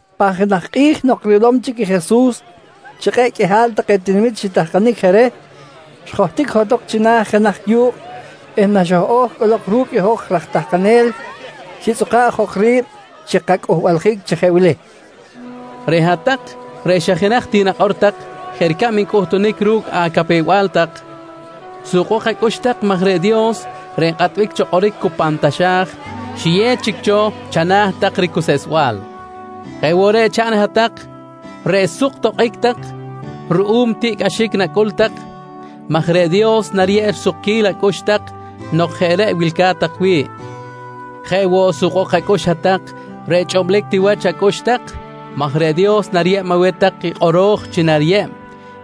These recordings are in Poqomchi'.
Pan jenaj kꞌi̱j nok rilom chic Jesus chi kꞌe̱ꞌ qꞌuihal take tinamit xitahkanic je reh, xjohtic johtok china̱ jenaj yu̱kꞌ eh naxoj-o̱j cꞌolok ru̱cꞌ i hoj raj tahkanel, xitzꞌuka̱ꞌ jok ri̱b chi kacꞌuhbaljic chi jeꞌ wili: «Reꞌ hat-tak reꞌ xa jenaj ti nakꞌor tak jeꞌ ricab ncꞌuhtunic ru̱cꞌ acapew-bal tak, sukbok acꞌux tak maj reꞌ Dios reꞌ nkꞌatbic cho kꞌoric cu pan taxa̱j, xiyew chic cho chana̱ tak i ricuseꞌsbal. «Jeꞌ woꞌ reꞌ chaꞌn i hat-tak reꞌ suk tokꞌic tak ruꞌum tiꞌcꞌaxic nacꞌul tak maj reꞌ Dios nariyeb risukquil acꞌux tak nok jeꞌ reꞌ wilca̱t tak wi̱ꞌ. «Jeꞌ woꞌ, sukbok woꞌ acꞌux hat-tak reꞌ chꞌublic ti wach acꞌux tak maj reꞌ Dios nariyeb aweh tak i kꞌoro̱j chi nariyeb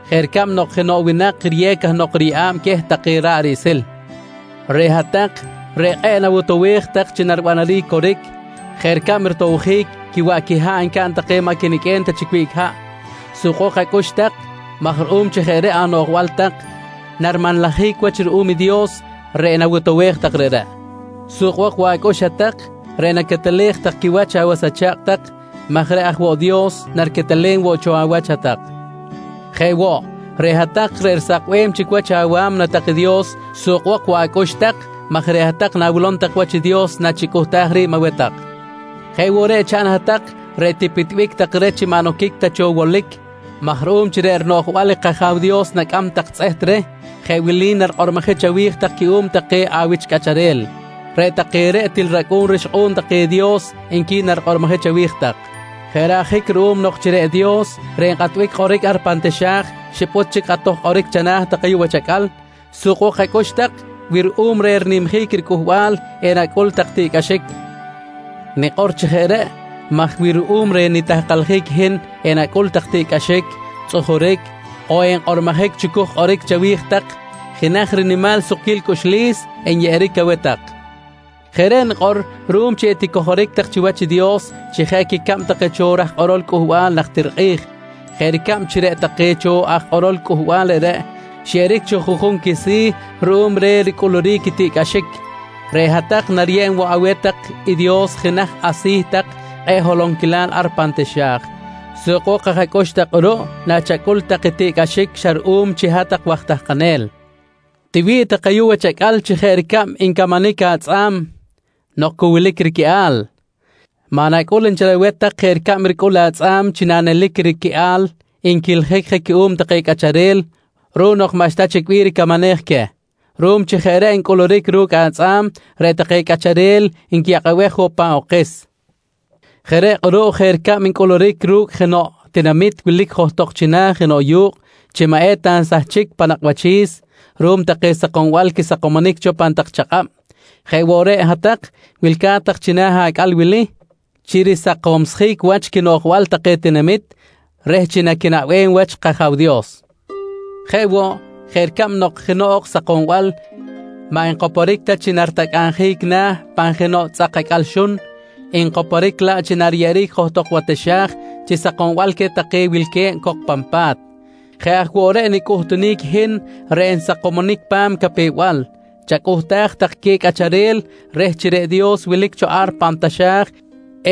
jeꞌ ricab nok jenoꞌ winak riyew cahnok riyeꞌa̱b queh take ra̱ꞌ riꞌsil. «Reꞌ hat-tak reꞌ kꞌe̱ꞌ nawotowej tak chi naribanaric i coric, jeꞌ ricab rotowjic quiwaꞌ quiha̱ꞌ ncaꞌn take maꞌ quiniqꞌuem ta chic wiꞌc haꞌ, sukbok acꞌux tak maj ruꞌum chi jeꞌ reꞌ anoꞌjbal tak narimanlajic wach ruꞌum i Dios reꞌ nawotowej tak reꞌreꞌ. «Sukbok woꞌ acꞌux hat-tak reꞌ naquetelej tak quiwach awas acha̱kꞌ tak, maj reꞌ aj woꞌ Dios nariquetelem woꞌ cho awach hat-tak. «Jeꞌ woꞌ, reꞌ hat-tak reꞌ risakbem chic wach awa̱mna tak i Dios sukbok woꞌ acꞌux tak, maj reꞌ hat-tak nawilom tak wach i Dios nachicꞌuhtaj ri̱b aweh tak. «Jeꞌ woꞌ reꞌ chaꞌn i hat-tak reꞌ tipitbic tak reh chi maꞌ noquic ta cho wolic, maj ruꞌum chi reꞌ rinoꞌjbal kAja̱w Dios nacꞌam tak tzꞌeht reh jeꞌ wili narikꞌormojic chawi̱j tak cuꞌum take awich cꞌacharel: ‹Reꞌ take reꞌ til racꞌu̱n rixkꞌu̱n take i Dios, nqui narikꞌormojic chawi̱j tak. «Jeꞌ reꞌ ajic ruꞌum nok chi reꞌ Dios reꞌ nkꞌatbic kꞌoric ar pan taxa̱j xipꞌut chic i kꞌatoj kꞌoric chana̱ tak ayuꞌ wach acꞌal, sukbok acꞌux tak wi ruꞌum reh rinimjic riCꞌuhbal enacꞌul tak i tiꞌcꞌaxic. Nikꞌor chi jeꞌ reꞌ maj wi ruꞌum reh nitahkaljic i hin enacꞌul tak tiꞌcꞌaxic, tzꞌujuric on enkꞌormojic chucuj kꞌoric chawi̱j tak, jenaj rinimal sukquil cꞌuxlis enyeꞌeric aweh tak. Jeꞌ reꞌ nikꞌor ruꞌum chi eticojoric tak chiwach i Dios chi jeꞌ quicab take cho raj kꞌorol Cꞌuhbal najtir kꞌi̱j. Jeꞌ ricab chi reꞌ take cho aj kꞌorol cꞌuhbal reꞌreꞌ xyeꞌeric cho juꞌjun quisi̱ ruꞌum reh ricꞌuluric i tiꞌcꞌaxic, reꞌ hat-tak nariyeb woꞌ aweh tak i Dios jenaj asi̱ tak kꞌe̱ꞌ holonquilal ar pan taxa̱j. Sukbok aj acꞌux tak kꞌuruꞌ nachacꞌul tak i tiꞌcꞌaxic xa ruꞌum chi hat-tak waj tahkanel. «Tiwi̱ꞌ tak ayuꞌ wach acꞌal chi jeꞌ ricab ncamanic atzꞌa̱m nok cu wilic riquiꞌal. Maꞌ nacꞌul nchel aweh tak jeꞌ ricab ricꞌul atzꞌa̱m chi nanelic riquiꞌal nquiljic je cuꞌum take cꞌacharel ruꞌum nok maꞌxta chic bih ricamanej queh. Ruꞌum chi jeꞌ reꞌ ncꞌuluric ru̱cꞌ atzꞌa̱m, reꞌ take cꞌacharel nquiyakꞌabej woꞌ pan okis. Jeꞌ reꞌ kꞌuruꞌ jeꞌ ricab ncꞌuluric ru̱cꞌ jenoꞌ tinamit wilic johtok china̱ jenoꞌ yu̱kꞌ chi maꞌ eta nsahchic pan nakꞌ wachi̱s ruꞌum take sakombal quisakomonic cho chipam pan tak chakꞌab, jeꞌ woꞌ reꞌ hat-tak wilca̱t china̱ acꞌal wili chi risakomsjic wach quinoꞌjbal take tinamit reh chi naquinaꞌbem wach i kAja̱w Dios. Jeꞌ woꞌ, jeꞌ ricab nok jenoꞌ ok sakombal maꞌ nkoporic ta chi naritacꞌabjic na̱ pan jenoꞌ tzꞌak acꞌal xun, nkoporic laꞌ chi nariyeꞌeric johtok wa taxa̱j chi sakombal queh take wilque̱b cok pan pa̱t, jeꞌ aj woꞌ reꞌ nicꞌuhtunic i hin reꞌ nsakomonic pa̱m capew-bal, chacꞌuhtaj tak queh cꞌacharel reh chi reꞌ Dios wilic cho ar pan taxa̱j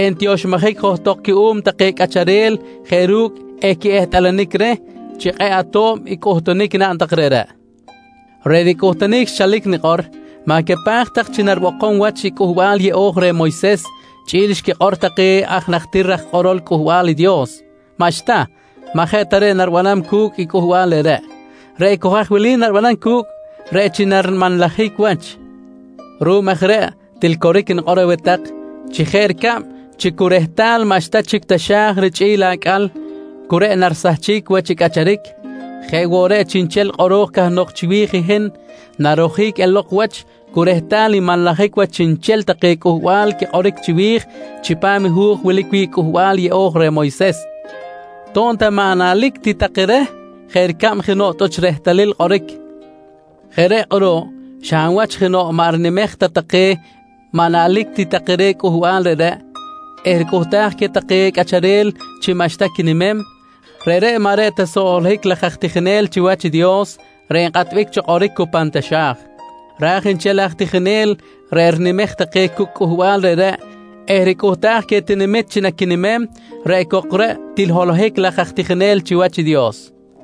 entioxmojic johtok cuꞌum take cꞌacharel jeꞌ ru̱cꞌ equiꞌehtꞌalanic reh chi kꞌe̱ꞌ ato̱b i cꞌuhtunic naꞌn tak reꞌreꞌ. «Reꞌ nicꞌuhtunic xchalic nikꞌor, ma̱capaj tak chi naribokom wach i Cꞌuhbal yeꞌo̱j reh Moyses chꞌi̱l xquikꞌor take aj najtir raj kꞌorol Cꞌuhbal i Dios. Maꞌxta! Maꞌ jeꞌ ta reꞌ naribanam cu̱cꞌ i cꞌuhbal reꞌreꞌ. Reꞌ cok haj wilic naribanam cu̱cꞌ reꞌ chi narimanlajic wach. Ruꞌum aj reꞌ til coric nikꞌor aweh tak chi jeꞌ ricab chi cu rehtal maꞌxta chic i taxa̱j richꞌi̱l acꞌal cu reꞌ narisahchic wach i cꞌacharic, jeꞌ woꞌ reꞌ chiꞌnchel kꞌoro̱j cahnok chiwi̱j i hin narojic elok wach cu rehtal nmanlajic wach chiꞌnchel take Cꞌuhbal quikꞌoric chiwi̱j chipam i hu̱j wilic wi̱ꞌ i Cꞌuhbal Yeꞌo̱j reh Moyses, to̱b ta maꞌ naꞌlic ti take reh jeꞌ ricab jenoꞌ tꞌuch rehtalil kꞌoric. Jeꞌ reꞌ kꞌuruꞌ, xa hab wach jenoꞌ maꞌ rinimej ta take maꞌ naꞌlic ti take reh cꞌuhbal reꞌreꞌ eh ricꞌuhtaj queh take cꞌacharel chi maꞌxta quinimem, reꞌreꞌ maꞌ reꞌ ta soꞌ holohic laj aj tijinel chiwach i Dios reꞌ nkꞌatbic cho kꞌoric cu pan taxa̱j. Raj nchel aj tijinel reꞌ rinimej take cucꞌ cꞌuhbal reꞌreꞌ eh ricꞌuhtaj queh tinamit chi naquinimem, reꞌ cok reꞌ til holohic laj aj tijinel chiwach i Dios.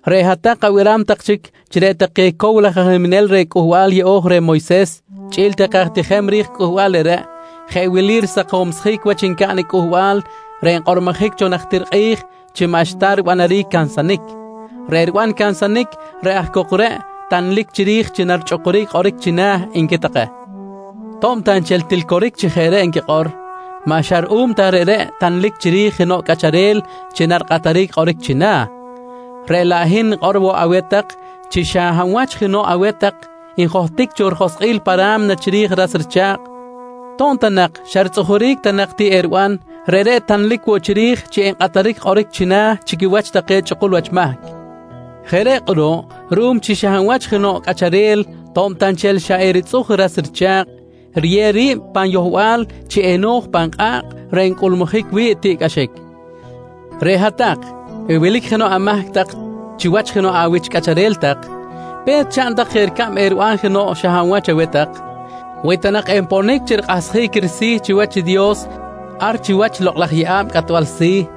«Reꞌ hat-tak abiram tak chi reꞌ take cow laj aj niminel reh Cꞌuhbal Yeꞌo̱j reh Moyses chꞌi̱l take aj tijem ri̱j cꞌuhbal reꞌreꞌ, jeꞌ wili risakomsjic wach ncaꞌn i cꞌuhbal reꞌ xkꞌormojic cho najtir kꞌi̱j chi maꞌxta ribanaric i cansanic: ‹Reꞌ riban cansanic, reꞌ aj cok reꞌ tanlic chiri̱j chi narichꞌukuric kꞌoric china̱, nqui take. «To̱b ta nchel til coric chi jeꞌ reꞌ nquikꞌor, maꞌ xa ta ruꞌum reꞌreꞌ tanlic chiri̱j jenoꞌ cꞌacharel chi narikꞌataric kꞌoric china̱, reꞌ laꞌ hin nikꞌor woꞌ aweh tak chi xa hab wach jenoꞌ aweh tak njohtic cho joskꞌil pa ra̱mna chiri̱j i ras richa̱kꞌ to̱b ta nak xa ritzꞌujuric ta nak ti eriban, reꞌreꞌ tanlic woꞌ chiri̱j chi enkꞌataric kꞌoric china̱ chi quiwach take chꞌukul wach mahc. Jeꞌ reꞌ kꞌuruꞌ, ruꞌum chi xa hab wach jenoꞌ cꞌacharel to̱b ta nchel xa eritzꞌuj i ras richa̱kꞌ, riyew ri̱b pan yohbal chi eno̱j pan kꞌa̱kꞌ reꞌ ncꞌulmujic wi̱ꞌ tiꞌcꞌaxic, reꞌ hat-tak wi wilic jenoꞌ amahc tak chiwach jenoꞌ awich cꞌacharel tak, pe̱t chaꞌn tak jeꞌ ricab nak eriban jenoꞌ xa hab wach aweh tak wi ta nak enponic chi rikꞌahsjic risi̱ chiwach i Dios ar chiwach i lokꞌ laj yeꞌa̱b cꞌatbal si̱.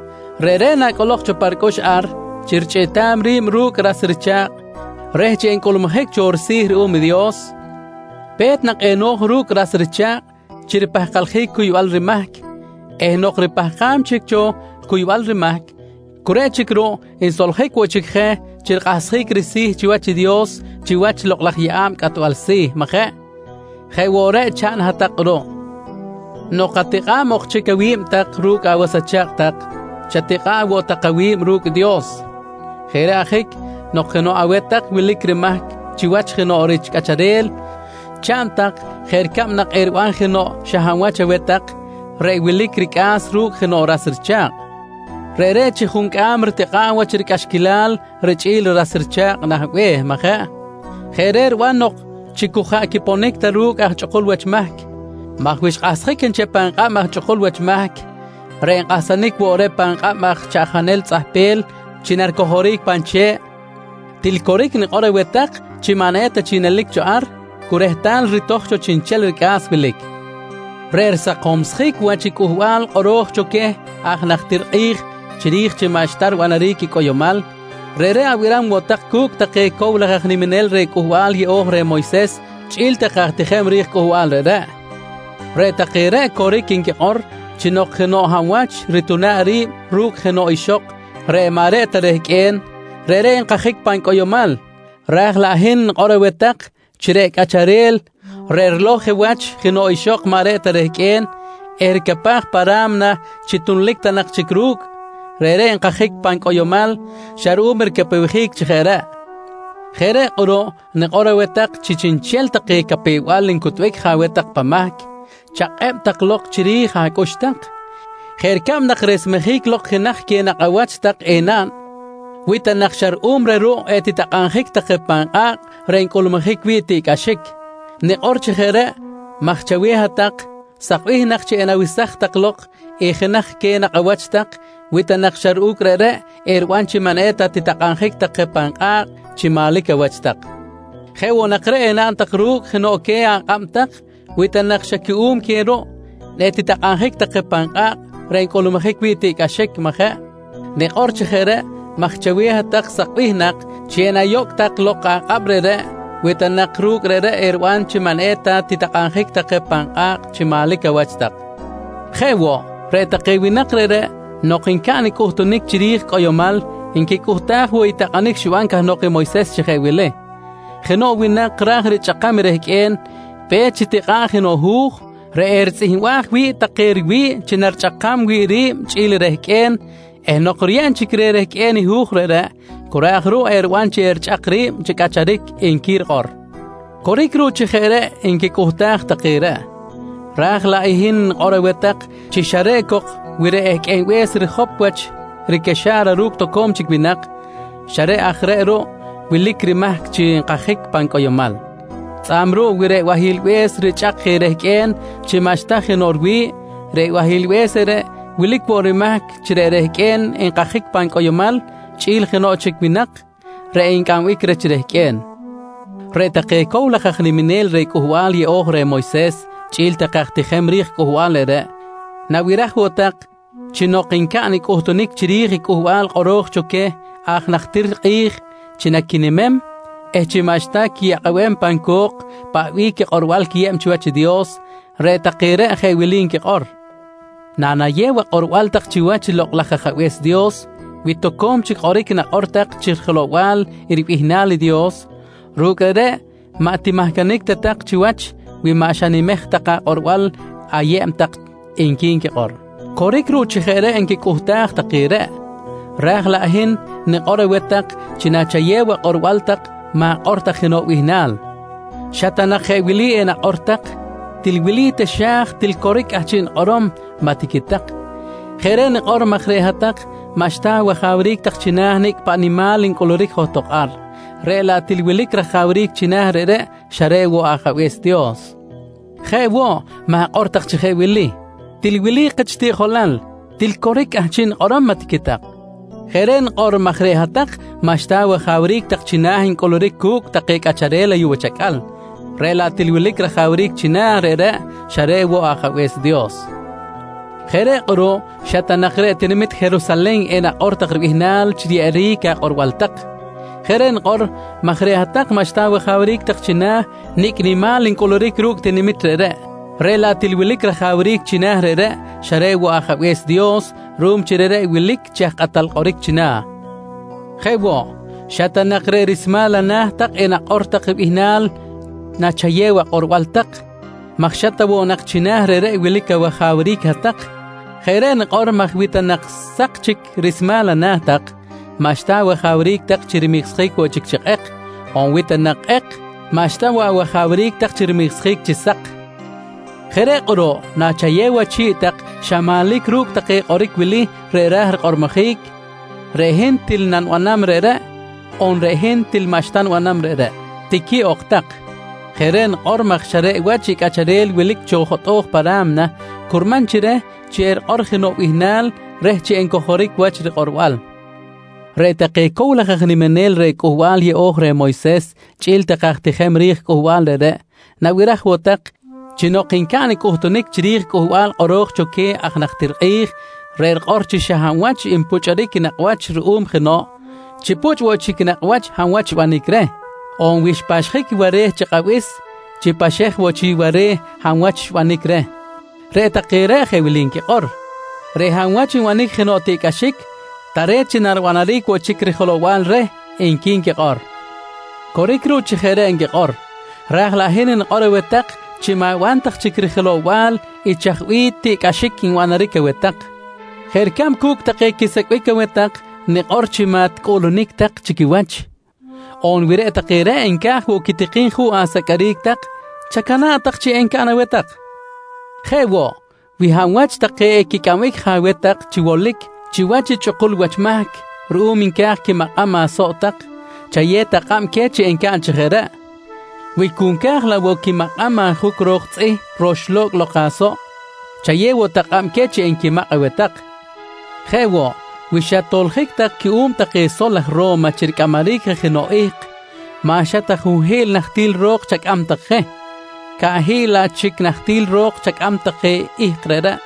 Reꞌreꞌ nacꞌolok cho pa ricꞌux ar chi richꞌiꞌtam ri̱b ru̱cꞌ i ras richa̱kꞌ, reh chi encꞌulmujic cho risi̱ ruꞌum i Dios, pe̱t nak eno̱j ru̱cꞌ i ras richa̱kꞌ chi ripahkaljic cuybal rimahc eh nok cu ripahkam chic cho cuybal rimahc, cu reꞌ chic ruꞌ nsoljic woꞌ chic je chi rikꞌahsjic risi̱ chiwach i Dios chiwach i lokꞌ laj yeꞌa̱b cꞌatbal si̱, majeꞌ? Jeꞌ woꞌ reꞌ chaꞌn hat-tak kꞌuruꞌ nok atikꞌa̱b ok chic awi̱b tak ru̱cꞌ awas acha̱kꞌ tak, chatikꞌa̱ꞌ woꞌ tak awi̱b ru̱cꞌ i Dios. «Jeꞌ reꞌ ajic, nok jenoꞌ aweh tak wilic rimahc chiwach jenoꞌ rich cꞌacharel chaꞌn tak jeꞌ ricab nak eriban jenoꞌ xa hab wach aweh tak reꞌ wilic ricꞌa̱s ru̱cꞌ jenoꞌ ras richa̱kꞌ. Reꞌreꞌ chi juncꞌam ritikꞌa̱ꞌ wach ricꞌaxquilal richꞌi̱l i ras richa̱kꞌ nah be̱h, majeꞌ? Jeꞌ reꞌ riban nok chi cu jaꞌ quiponic ta ru̱cꞌ aj chꞌukul wach mahc, maj wi xkꞌahsjic nchel pan kꞌab aj chꞌukul wach mahc reꞌ enkꞌahsanic woꞌ reh pan kꞌab aj chaꞌjanel tzꞌahpel chi naricojoric pan che̱ꞌ, til coric nikꞌor aweh tak chi maꞌ eta ta chic nelic cho ar, cu rehtal ritoj cho chiꞌnchel ricꞌa̱s wilic. «Reꞌ risakomsjic wach i cꞌuhbal kꞌoro̱j cho queh aj najtir kꞌi̱j chiri̱j chi maꞌxta ribanaric i cꞌoyomal, reꞌreꞌ abiram woꞌ tak cu̱cꞌ take cow laj aj niminel reh Cꞌuhbal Yeꞌo̱j reh Moyses chꞌi̱l take aj tijem ri̱j cꞌuhbal reꞌreꞌ. Reꞌ take reꞌ coric nquikꞌor chi nok jenoꞌ hab wach rituna̱ꞌ ri̱b ru̱cꞌ jenoꞌ ixok reꞌ maꞌ reꞌ ta rehqꞌue̱n, reꞌreꞌ nkajic pan cꞌoyomal raj laꞌ hin nikꞌor aweh tak chi reꞌ cꞌacharel reꞌ rilow je wach jenoꞌ ixok maꞌ reꞌ ta rehqꞌue̱n eh ricapaj pa ra̱mna chi tunlic ta nak chic ru̱cꞌ, reꞌreꞌ nkajic woꞌ pan cꞌoyomal xa ruꞌum ricapewjic chi jeꞌ reꞌ. Jeꞌ reꞌ kꞌuruꞌ nikꞌor aweh tak chi chiꞌnchel take capew-bal ncutbic aweh tak pan mahc chakꞌeb tak lok chiri̱j acꞌux tak, jeꞌ ricab nak resmejic lok jenaj queh nakꞌ awach tak enaꞌn wi ta nak xa ruꞌum reh ruꞌ etitakꞌabjic tak je pan kꞌa̱kꞌ reꞌ ncꞌulmujic wi̱ꞌ i tiꞌcꞌaxic. Nikꞌor chi jeꞌ reꞌ maj chaweh hat-tak, sakbih nak chi enawesaj tak lok i jenaj queh nakꞌ awach tak wi ta nak ru̱cꞌ reꞌreꞌ eriban chi maꞌ eta nak titakꞌmajic tak je pan kꞌa̱kꞌ chi manlic awach tak. Jeꞌ woꞌ nak reꞌ enaꞌn tak ru̱cꞌ jenoꞌ queh akꞌab tak wi ta nak xa cuꞌum queh ruꞌ etitakꞌabjic tak je pan kꞌa̱kꞌ reꞌ ncꞌulmujic wi̱ꞌ tiꞌcꞌaxic, majeꞌ? Nikꞌor chi jeꞌ reꞌ maj chaweh hat-tak sakbih nak chi enayocꞌ tak lok akꞌab reꞌreꞌ wi ta nak ru̱cꞌ reꞌreꞌ eriban chi maꞌ eta nak titakꞌabjic tak je pan kꞌa̱kꞌ chi manlic awach tak. «Jeꞌ woꞌ, reꞌ take winak reꞌreꞌ nok ncaꞌn i cꞌuhtunic chiri̱j i cꞌoyomal nquicꞌuhtaj woꞌ i takꞌanic xiban cahnok i Moyses chi jeꞌ wili: ‹Jenoꞌ winak ra̱j richꞌakam i rehqꞌue̱n, pe̱t chitikꞌa̱ꞌ jenoꞌ hu̱j reꞌ eritzꞌihmbaj wi̱ꞌ take riwi̱ꞌ chi narichꞌakam wi̱ꞌ ri̱b chꞌi̱l i rehqꞌue̱n eh nok riyeb chic reh rehqꞌue̱n i hu̱j reꞌreꞌ, cu reꞌ aj ruꞌ eriban chi erichꞌak ri̱b chi cꞌacharic, nqui rikꞌor. «Coric ruꞌ chi jeꞌ reꞌ nquicꞌuhtaj take reꞌ, raj laꞌ hin nikꞌor aweh tak chi xa reꞌ cok wi reꞌ ehqꞌuenbe̱s rijop wach ricaxa̱ra ru̱cꞌ toco̱m chic winak, xa reꞌ aj reꞌ ruꞌ wilic rimahc chi nkajic pan cꞌoyomal. Tzꞌa̱b ruꞌ, wi reꞌ bahilbe̱s richꞌak je i rehqꞌue̱n chi maꞌxta jenoꞌ riwi̱ꞌ, reꞌ bahilbe̱s reꞌreꞌ wilic woꞌ rimahc chi reꞌ rehqꞌue̱n nkajic pan cꞌoyomal chꞌi̱l jenoꞌ chic winak reꞌ encꞌambic reh chi rehqꞌue̱n. «Reꞌ take cow laj aj niminel reh Cꞌuhbal Yeꞌo̱j reh Moyses chꞌi̱l take aj tijem ri̱j cꞌuhbal reꞌreꞌ, nabiraj woꞌ tak chi nok ncaꞌn i cꞌuhtunic chiri̱j i cꞌuhbal kꞌoro̱j cho queh aj najtir kꞌi̱j chi naquinimem eh chi maꞌxta quiyakꞌabem pan co̱k paꞌ bih quikꞌorbal nquiyew chiwach i Dios, reꞌ take reꞌ jeꞌ wili nquikꞌor: ‹Nanayew akꞌorbal tak chiwach i Lokꞌ laj Ajabe̱s Dios, wi toco̱m chic kꞌoric nakꞌor tak chi rijelow-bal ribihnal i Dios, ru̱cꞌ reꞌreꞌ maꞌ timahcanic ta tak chiwach wi maꞌ xanimej tak akꞌorbal ayeb tak, nqui nquikꞌor. «Coric ruꞌ chi jeꞌ reꞌ nquicꞌuhtaj take reꞌ, raj laꞌ hin nikꞌor aweh tak chi nachayew akꞌorbal tak ma̱kꞌor tak jenoꞌ bihnal. Xa ta nak jeꞌ wili enakꞌor tak: ‹Til wili taxa̱j til coric i cꞌahchiꞌ nikꞌorom, maꞌ tiquitak. «Jeꞌ reꞌ nikꞌor maj reꞌ hat-tak maꞌxta awajawric tak china̱ i nicꞌ paꞌ nimal ncꞌuluric johtok ar, reꞌ laꞌ til wilic rajawric china̱ reꞌreꞌ xa reꞌ woꞌ i Ajabe̱s Dios. Jeꞌ woꞌ, ma̱kꞌor tak chi jeꞌ wili: ‹Til wili kich tiꞌjolal, til coric i cꞌahchiꞌ nikꞌorom, maꞌ tiquitak. «Jeꞌ reꞌ nikꞌor maj reꞌ hat-tak maꞌxta awajawric tak china̱ ncꞌuluric cu̱cꞌ take cꞌacharel ayuꞌ wach acꞌal, reꞌ laꞌ til wilic rajawric china̱ reꞌreꞌ xa reꞌ woꞌ i Ajabe̱s Dios. Jeꞌ reꞌ kꞌuruꞌ, xa ta nak reꞌ tinamit Jerusalen enakꞌor tak ribihnal chi riyeꞌeric akꞌorbal tak. Jeꞌ reꞌ nikꞌor maj reꞌ hat-tak maꞌxta awajawric tak china̱ nicꞌ nimal ncꞌuluric ru̱cꞌ i tinamit reꞌreꞌ, reꞌ laꞌ til wilic rajawric china̱ reꞌreꞌ xa reꞌ woꞌ i Ajabe̱s Dios ruꞌum chi reꞌreꞌ wilic chi aj kꞌatal kꞌoric china̱. Jeꞌ woꞌ, xa ta nak reꞌ rismal ana̱ tak enakꞌor tak bihnal nachayew akꞌorbal tak maj xa ta nak woꞌ china̱ reꞌreꞌ wilic awajawric hat-tak. Jeꞌ reꞌ nikꞌor maj wi ta nak sak chic i rismal ana̱ tak, maꞌxta awajawric tak chi rimiksjic woꞌ chic chi kꞌek, on wi ta nak kꞌek, maꞌxta woꞌ awajawric tak chi rimiksjic chi sak. «Jeꞌ reꞌ kꞌuruꞌ nachayew achi̱ꞌ tak xa manlic ru̱cꞌ i take kꞌoric wili reꞌ raj rikꞌormojic: ‹Reꞌ hin til nanibanam reꞌreꞌ on reꞌ hin til maꞌxta nibanam reꞌreꞌ, tiqui ok tak. «Jeꞌ reꞌ nikꞌor maj xa reꞌ wach i cꞌacharel wilic cho jotꞌo̱j pa ra̱mna curman chi reh chi erikꞌor jenoꞌ bihnal reh chi encojoric wach i rikꞌorbal. «Reꞌ take cow laj aj niminel reh Cꞌuhbal Yeꞌo̱j reh Moyses chꞌi̱l take aj tijem ri̱j cꞌuhbal reꞌreꞌ nabiraj woꞌ tak chi nok ncaꞌn i cꞌuhtunic chiri̱j i cꞌuhbal kꞌoro̱j cho queh aj najtir kꞌi̱j, reꞌ rikꞌor chi xa hab wach enpuchꞌuric i nakꞌ wach ruꞌum jenoꞌ, chi puchꞌ woꞌ chic nakꞌ wach i hab wach xbanic reh on wi xpaxjic ware̱ chi kꞌabis, chi paxej woꞌ chic ware̱ i hab wach xbanic reh, reꞌ take reꞌ jeꞌ wili nquikꞌor: ‹Reꞌ hab wach nbanic jenoꞌ tiꞌcꞌaxic, tare̱t chi naribanaric woꞌ chic rijelow-bal reh, nqui nquikꞌor. «Coric ruꞌ chi jeꞌ reꞌ nquikꞌor, raj laꞌ hin nikꞌor aweh tak chi ma̱ban tak chic rijelow-bal i chaj bih tiꞌcꞌaxic nbanaric aweh tak. Jeꞌ ricab cu̱cꞌ take quisecꞌbic aweh tak nikꞌor chi maꞌ ticꞌuꞌlunic tak chi quiwach. On wi reꞌ take reꞌ nca̱j woꞌ quitikim juꞌ aseqꞌueric tak, chacana̱ꞌ tak chi encaꞌn aweh tak. Jeꞌ woꞌ, wi hab wach take equicꞌambic je aweh tak chi wolic chiwach i chꞌukul wach mahc ruꞌum nca̱j quimakꞌam asoꞌ tak, chayew tak kꞌab queh chi encaꞌn chi jeꞌ reꞌ. Wi cu nca̱j laꞌ woꞌ quimakꞌam ajuc ro̱k tzꞌih roxlo̱cꞌ lok asoꞌ, chayew woꞌ tak kꞌab queh chi enquimakꞌ aweh tak. Jeꞌ woꞌ, wi xat-toljic tak cuꞌum take sol aj Ro̱ma chi ricꞌamaric je jenoꞌ ihk, maꞌ xa ta junhi̱ꞌl nahtil ro̱k chacꞌam tak je, caꞌhiꞌl laꞌ chic nahtil ro̱k chacꞌam tak je i ihk reꞌreꞌ.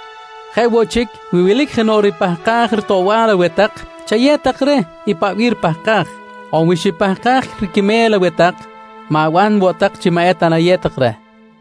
Jeꞌ woꞌ chic, wi wilic jenoꞌ ripahkaj ritoꞌbal aweh tak, chayew tak reh i paꞌ bih ripahkaj. On wi xipahkaj riquime̱l aweh tak, ma̱ban woꞌ tak chi maꞌ eta nayew tak reh.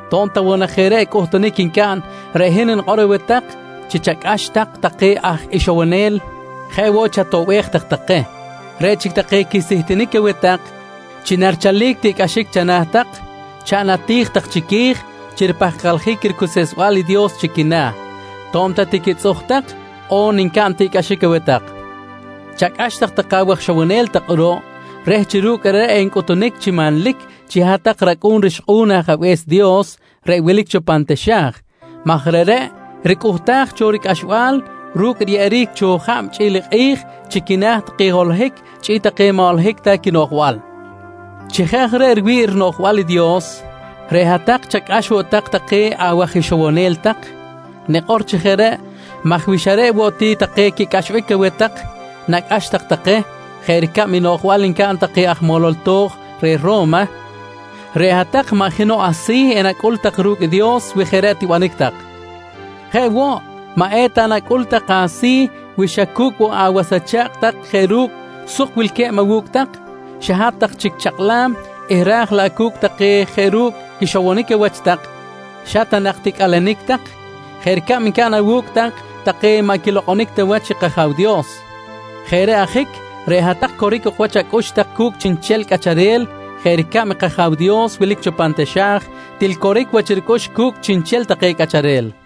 «To̱b ta woꞌ jeꞌ reꞌ cꞌuhtunic ncaꞌn, reꞌ hin nikꞌor aweh tak chi chacꞌax tak take aj ixowonel jeꞌ woꞌ chatoꞌbej tak take. Reꞌ chic take quisihtinic aweh tak chi narichalic tiꞌcꞌaxic chana̱ tak, chaꞌn ati̱j tak chiqui̱j chi ripahkaljic ricuseꞌsbal i Dios chi quina̱ to̱b ta tiquitzꞌuj tak on ncaꞌn tiꞌcꞌaxic aweh tak. «Chacꞌax take awaj ixowonel tak kꞌuruꞌ reh chi ru̱cꞌ reꞌreꞌ encꞌutunic chi manlic chi hat-tak racꞌu̱n rixkꞌu̱n i Ajabe̱s Dios reꞌ wilic cho pan taxa̱j maj reꞌreꞌ ricꞌuhtaj cho ricꞌaxbal ru̱cꞌ riyeꞌeric cho jab chꞌi̱l i kꞌi̱j chi quina̱ take holohic chꞌi̱l take maꞌ holohic ta quinoꞌjbal. «Chi jeꞌ aj reꞌ riwi̱ꞌ rinoꞌjbal i Dios, reꞌ hat-tak chacꞌax woꞌ tak take awaj ixowonel tak. Nikꞌor chi jeꞌ reꞌ maj wi xa reꞌ woꞌ ti take quicꞌaxbic aweh tak nacꞌax tak take jeꞌ ricab i noꞌjbal ncaꞌn take aj molol to̱j reh Ro̱ma, reꞌ hat-tak maꞌ jenoꞌ asi̱ enacꞌul tak ru̱cꞌ i Dios wi jeꞌ reꞌ tibanic tak. Jeꞌ woꞌ maꞌ eta nacꞌul tak asi̱ wi xa cu̱cꞌ woꞌ awas acha̱kꞌ tak jeꞌ ru̱cꞌ suk wilque̱b awu̱cꞌ tak, xa hat-tak chic chakꞌlam eh raj laꞌ cu̱cꞌ take jeꞌ ru̱cꞌ quixowonic awach tak xa ta nak ticꞌalenic tak, jeꞌ ricab ncaꞌn awu̱cꞌ tak take maꞌ quilokꞌonic ta wach i kAja̱w Dios. Jeꞌ reꞌ ajic, reꞌ hat-tak coric ok wach acꞌux tak cu̱cꞌ chiꞌnchel cꞌacharel jeꞌ ricab i kAja̱w Dios wilic cho pan taxa̱j til coric wach ricꞌux cu̱cꞌ chiꞌnchel take cꞌacharel.